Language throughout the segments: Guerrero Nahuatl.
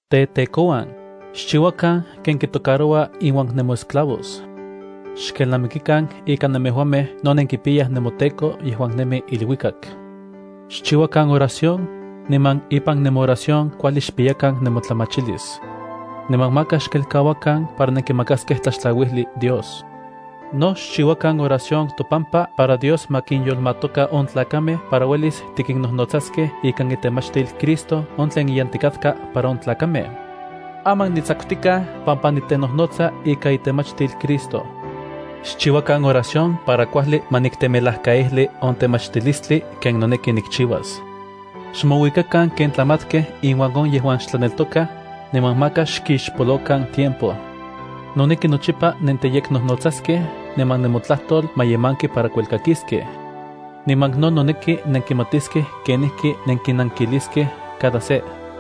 Tetekouan, xchiuakan ken kitocaroua inuan nemoesclavos. Xkelnamikikan ika nemejuamej no nenkipiyaj nemoTEKO yejuan nemi iluikak. Xchiuakan oración, niman ipan nemooración kuajli xpiyakan nemotlamachilis. Niman maka xkelkauakan para nenkimakaskej tlaxtlauijli Dios. No xchiuakan oración topampa para Dios ma kinyolmatoka on tlakamej para uelis tikinnojnotsaskej ikan itemachtil Cristo on tleniyantikatka para on tlakamej. Aman nitsakutikaj pampa nitenojnotsa ika itemachtil Cristo. Xchiuakan oración para kuajli ma niktemelajkaijli on temachtilistli ken noneki nikchiuas. Xmouikakan ken tlamatkej inuan on yejuan xtlaneltokaj, niman maka xkixpolokan tiempo. Noneki nochipa nenteyeknojnotsaskej niman nemotlajtol ma yemanki para kuelkakiskej. Niman no noneki nenkimatiskej kenijki nenkinankiliskej cada se.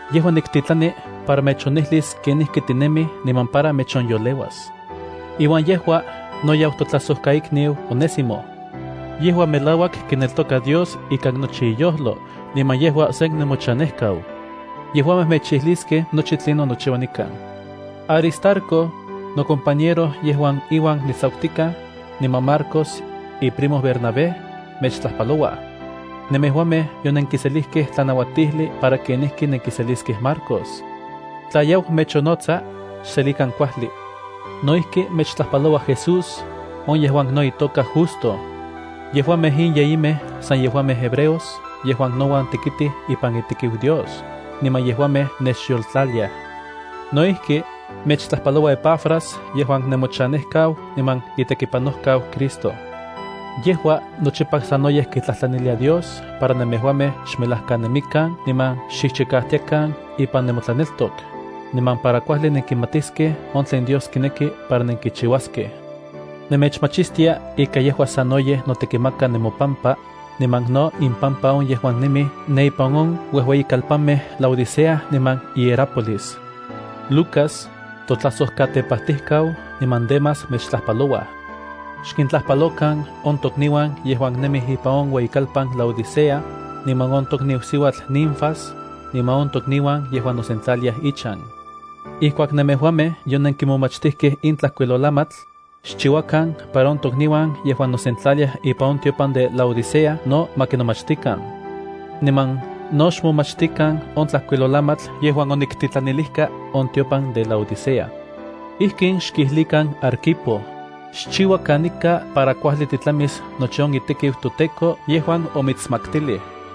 Yejua niktitlani para mechonijlis kenijki tinemij niman para mechonyoleuas. Iuan yejua no yau totlajsojkaikniu Onésimo. Yejua melauak kineltoka Dios ikan nochi iyojlo, niman yejua sen nemochanejkau. Yejuamej mechijliskej nochi tlinon nochiua nikan. Aristarco, nocompañero yejuan iuan nitsakutikaj, niman Marcos, iprimo Bernabé, mechtlajpalouaj. Nemejuamej yonenkiselijkej tlanauatijli para kenijki nenkiseliskej Marcos. Tla yau mechonnotsa, xselikan kuajli. No ijki mechtlajpaloua Jesús, on yejuan no itoka Justo. Yejuamej in yeyimej san yejuamej hebreos yejuan nouan tekitij ipan itekiu Dios, niman yejuamej nechyoltlaliaj. No ijki mechtlajpaloua Epafras yejuan nemochanejkau niman itekipanojkau Cristo. Yejua nochipa sanoyej kitlajtlanilia Dios para nemejuamej xmelajkanemikan niman xchijchikajtiakan ipan nemotlaneltok, niman para kuajli nenkimatiskej on tlen Dios kineki para nenkichiuaskej. Nemechmachistia ika yejua sanoyej notekimaka nemopampa, niman no impampa on yejuan nemij ne ipan on uejueyikalpanmej Laodicea niman Hierápolis. Lucas totlajsojkatepajtijkau niman Demas mechtlajpalouaj. Xkintlajpalokan on tokniuan yejuan nemij ipan on ueyikalpan Laodicea, niman on tokniu siuatl Ninfas, niman on tokniuan yejuan nosentlaliaj ichan. Ijkuak nemejuamej yonenkimomachtijkej in tlajkuilolamatl, xchiuakan para on tokniuan yejuan nosentlaliaj ipan on tiopan de Laodicea no ma kinomachtikan. Niman no xmomachtikan on tlajkuilolamatl yejuan oniktitlanilijka on tiopan de Laodicea. Ijkin xkijlikan Arquipo: “Xchiua kanika para kuajli titlamis nochi on itekiu toTEKO yejuan omitsmaktilij.”